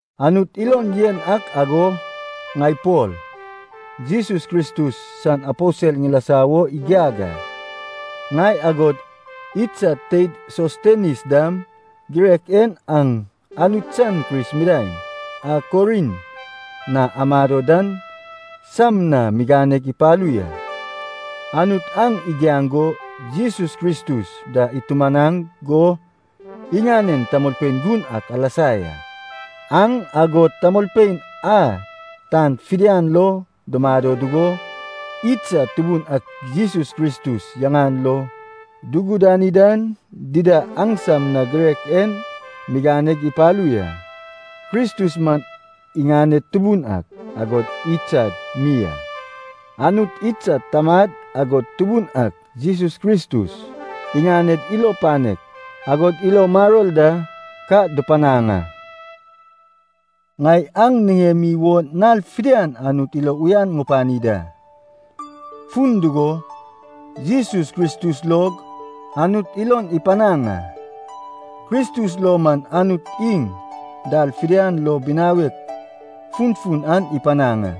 Anut ilon yen ak ago, ŋai Pol, Jesus Kristus san aposel ŋilasa wo igiag a. Ŋai, agod idsad teid Sostenis dam girek en aŋ Anut san Kris midaeŋ a Korint na amado dan sam na miganeg ipalu ya. Anut aŋ igiaŋ go Jesus Kristus da itumanaŋ go iŋanen tamolpein gun ak alasa ya. Aŋ agod tamolpein a tan fidian lo dumado dugo, idsad Tubun ak Jesus Kristus yaŋan lo dugudani dan dida, aŋsam na girek en miganeg ipalu ya. Kristus man iŋaned Tubun ak, agod idsad mi a. Anut idsad Tamad agod Tubun ak Jesus Kristus, iŋaned ilo panek agod ilo maror da ka dupanaŋ a. Ŋai aŋ niŋemi wo nal fidian Anut ilo uyan ŋupani da, fun dugo, Jesus Kristus log Anut ilon ipanaŋ a. Kristus lo man Anut iŋ dal fidian lo binawek funfun aŋ ipanaŋ a,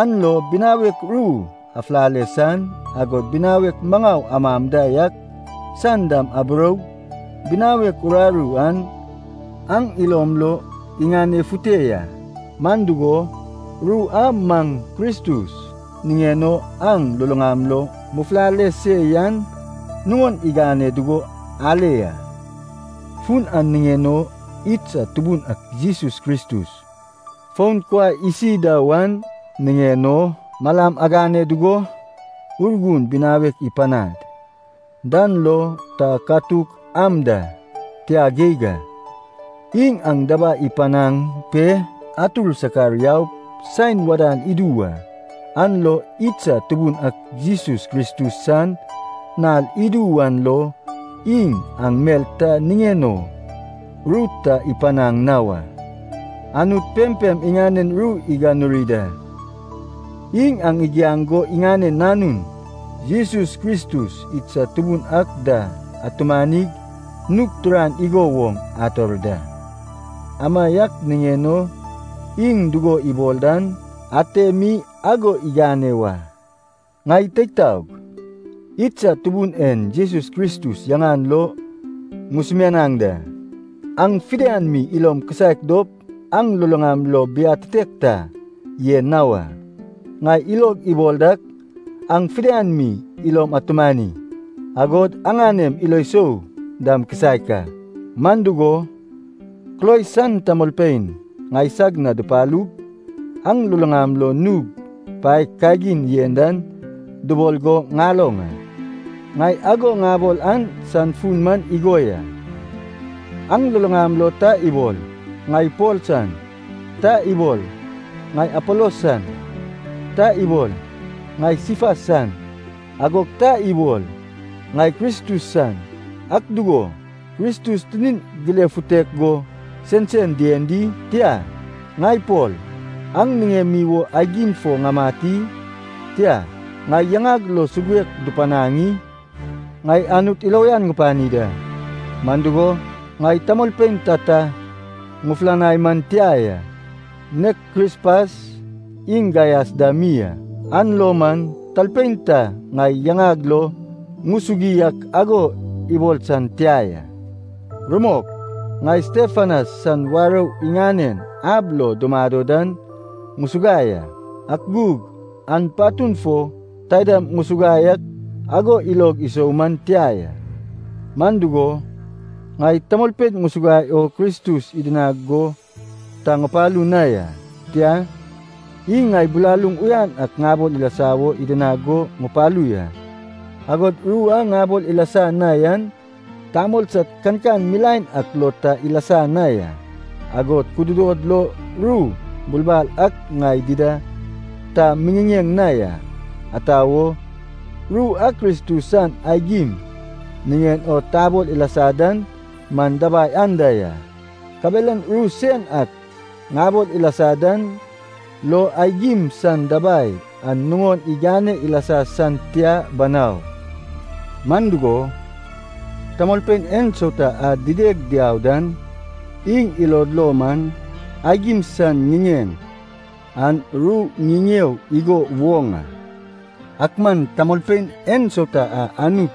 an lo binawek ru afulale san, agod binawek maŋau amam da yak san dam aburoug binawek uraru an aŋ ilom lo iŋanefute ya. Man dugo, ru a maŋ Kristus niŋen o aŋ luluŋam lo mufulale se yan nuŋon igane dugo ale ya. Fun an niŋen o idsad Tubun ak Jesus Kristus, fon kuai isi da wan niŋen o aŋ malam agane dugo, Urgun binawek ipanad dan lo ta katuk am da, tia geig a. Iŋ aŋ dabai ipanaŋ pe atur sakar yaup saen wadan idu wa, an lo idsad Tubun ak Jesus Kristus san nal idu wan lo iŋ aŋ mel ta niŋen o ru ta ipanaŋ na wa. Anut pempem iŋanen ru iganuri da. Iŋ aŋ igiaŋ go iŋanen Nanun, Jesus Kristus idsad Tubun ak da atumanig nug turan igo woŋ ator da. Amaiak niŋen o iŋ dugo ibol dan ate mi ago igane wa. Ŋai teig taog, idsad Tubun en Jesus Kristus yaŋan lo ŋusumianaŋ da, aŋ fidian mi ilom kisaek dop aŋ luluŋam lo biatitek ta yen na wa. Ŋai ilog ibol dak, aŋ fidian mi ilom atumani, agod aŋanem ilo sou dam kisaek a. Man dugo, Kloe san tamolpein ŋaisag na dupalug, aŋ luluŋam lo nug paek kagin yen dan dubol go ŋaloŋ a. Ŋai ago ŋabol an san fun man igo ya. Aŋ luluŋam lo ta ibol, “ŋai Pol san,” ta ibol, “ŋai Apolos san,” ta ibol, “ŋai Sifas san,” agog ta ibol, “ŋai Kristus san.” Ak dugo, Kristus tinin gilefutek go sensen dien di? Tia, ŋai Pol, aŋ niŋemi wo aigim fo ŋamat i? Tia, ŋai yaŋag lo suguek dupanaŋ i? Ŋai Anut ilo uyan ŋupani da, man dugo, ŋai tamolpein tata ŋufulanai man tia ya, nek Krispas iŋ Gaias da mi a. An lo man talpein ta ŋai yaŋag lo ŋusugui ak ago ibol san tia ya. Rumok, ŋai Stefanas san warou iŋanen ab lo dumado dan ŋusuguai a, ak gug an patun fo taidam ŋusuguai ak ago ilog isou man tia ya. Man dugo, ŋai tamolpein ŋusuguai o Kristus idinag go ta ŋupalu na ya. Tia, iŋ ŋai bilaluŋ uyan ak ŋabol ilasa wo idinag go ŋupalu ya. Agod ru a ŋabol ilasa na yan tamol sad kankan milaen ak lo ta ilasa na ya, agod kududod lo ru bulbal ak ŋai dida ta miŋiŋeŋ na ya. Ata wo? Ru a Kristus san aigim niŋen o tabol ilasa dan man dabai anda ya, kabelan ru sen ak ŋabol ilasa dan lo aigim san dabai an nuŋon igane ilasa san tia banau. Man dugo, tamolpein ensauta a dideg diau dan iŋ ilod lo man, aigim san ŋiŋeŋ an ru ŋiŋeo igo woŋ a. Ak man tamolpein ensauta a Anut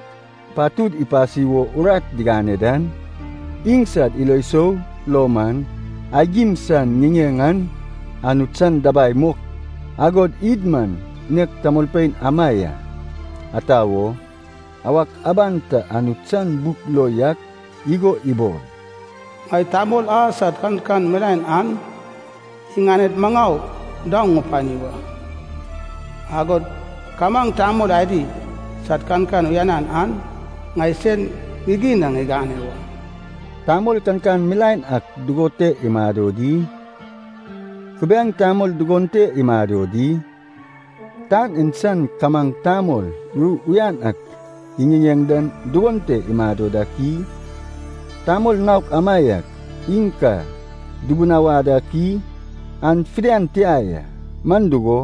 patud ipasi wo urat igane dan, iŋsad ilo sou lo man, aigim san ŋiŋeŋ an Anut san dabai mok. Agod id man nek tamolpein ama ya. Ata wo? Awak aban ta Anut san buk lo yak igo ibol, “Ŋai tamol a sad kankan milaen an iŋaned maŋau daoŋ ŋupani wa, agod kamaŋ tamol adi sad kankan uyanan an ŋai sen gigin na ŋigane wa.” Tamol kankan milaen ak dugon te imado di? Kubiaeŋ tamol dugon te imado di? Tan en san kamaŋ tamol ru uyan ak iŋiŋeŋ dan dugon te imado dak i? Tamol naok amaiak iŋ ka dubunawad ak i? An fidian tia ya, man dugo,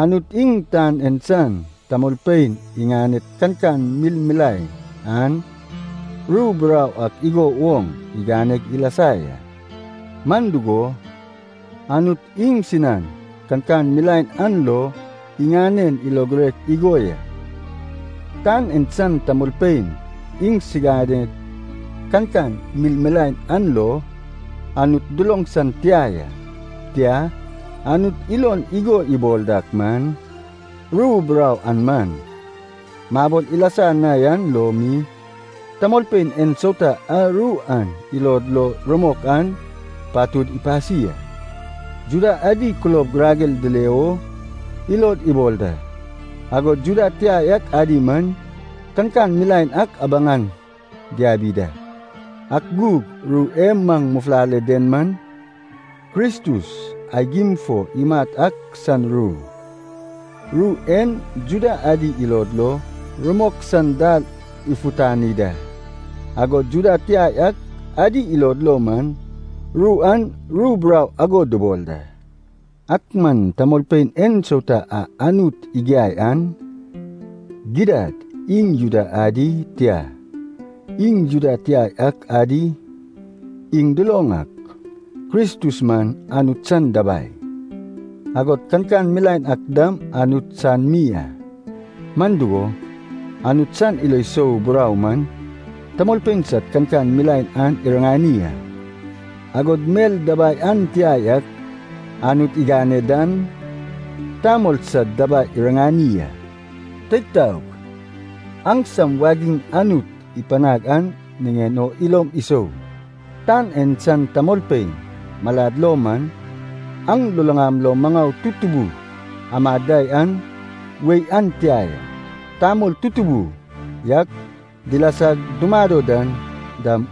Anut iŋ tan en san tamolpein iŋaned kankan milmilae an, ru burau ak igo woŋ iganeg ilasa ya. Man dugo, Anut iŋsinan kankan milaen an lo iŋanen ilo girek igo ya. Tan en san tamolpein iŋsiganed kankan milmilae an lo Anut duloŋ san tia ya. Tia, Anut ilon igo ibol dak man, ru burau a maŋ mabol ilasa na yan lo mi, tamolpein ensauta a ru an ilod lo rumok an, patud ipasi a. Juda adi kulob girager dile wo ilod ibol da, agod Juda tia yak adi man, kankan milaen ak abaŋ an diabi da. Ak gug ru e maŋ mufulale den man, Kristus aigim fo imat ak san ru. Ru en Juda adi ilod lo rumok san dal ifutani da, agod Juda tia yak adi ilod lo man, ru an ru burau ago dubol da. Ak man tamolpein ensauta a Anut igiai an, gidad iŋ Juda adi, tia, iŋ Juda tia yak adi, iŋ duloŋ ak, Kristus man Anut san dabai, agod kankan milaen ak dam Anut san mi a. Man dugo, Anut san ilo sou burau man, tamolpein sad kankan milaen an iriŋani a. Agod mel dabai an tia yak Anut igane dan, tamol sad dabai iriŋani a. Teig taog, aŋsam wagiŋ Anut ipanaŋ an niŋen o ilom isou. Tan en san tamolpein malad lo man, aŋ luluŋam lo maŋau tutubu amad da yan wei an tia ya. Tamol tutubu yak dilasag dumado dan dam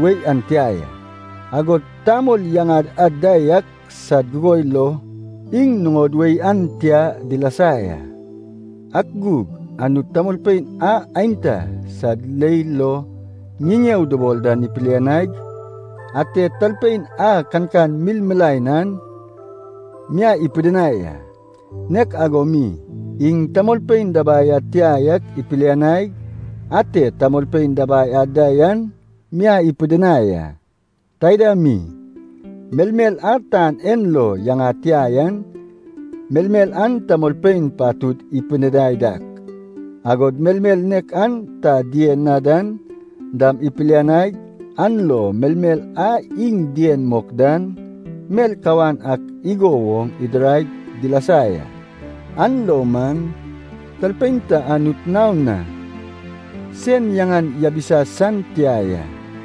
wei an tia ya. Agod tamol yaŋad an da yak sad gugoi lo iŋ nuŋod wei an tia dilasa ya. Ak gug Anut tamolpein a aenta sad leil lo ŋiŋeo dubol dan ipilianaig, ate talpein a kankan milmilae an miai ipidinai a. Nek ago mi, iŋ tamolpein dabai ad tia yak ipilianaig, ate tamolpein dabai ad da yan miai ipidinai a. Taida mi, melmel a tan en lo yaŋad tia yan, melmel a tamolpein patud dupidinai dak, agod melmel nek a ta dien na dan dam ipilianaig, an lo melmel a iŋ dien mok dan mel kawan ak igo woŋ idiraig dilasa ya. An lo man, talpein ta Anut naon na sen yaŋan yabisa san tia ya.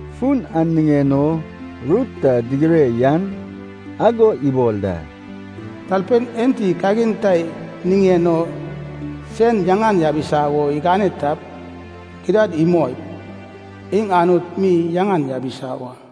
Fun an niŋen o ru ta digire yan ago ibol da, “Talpein enti kagin ta niŋen o sen yaŋan yabisa wo igane tap, gidad imoip, iŋ Anut mi yaŋan yabisa wa.”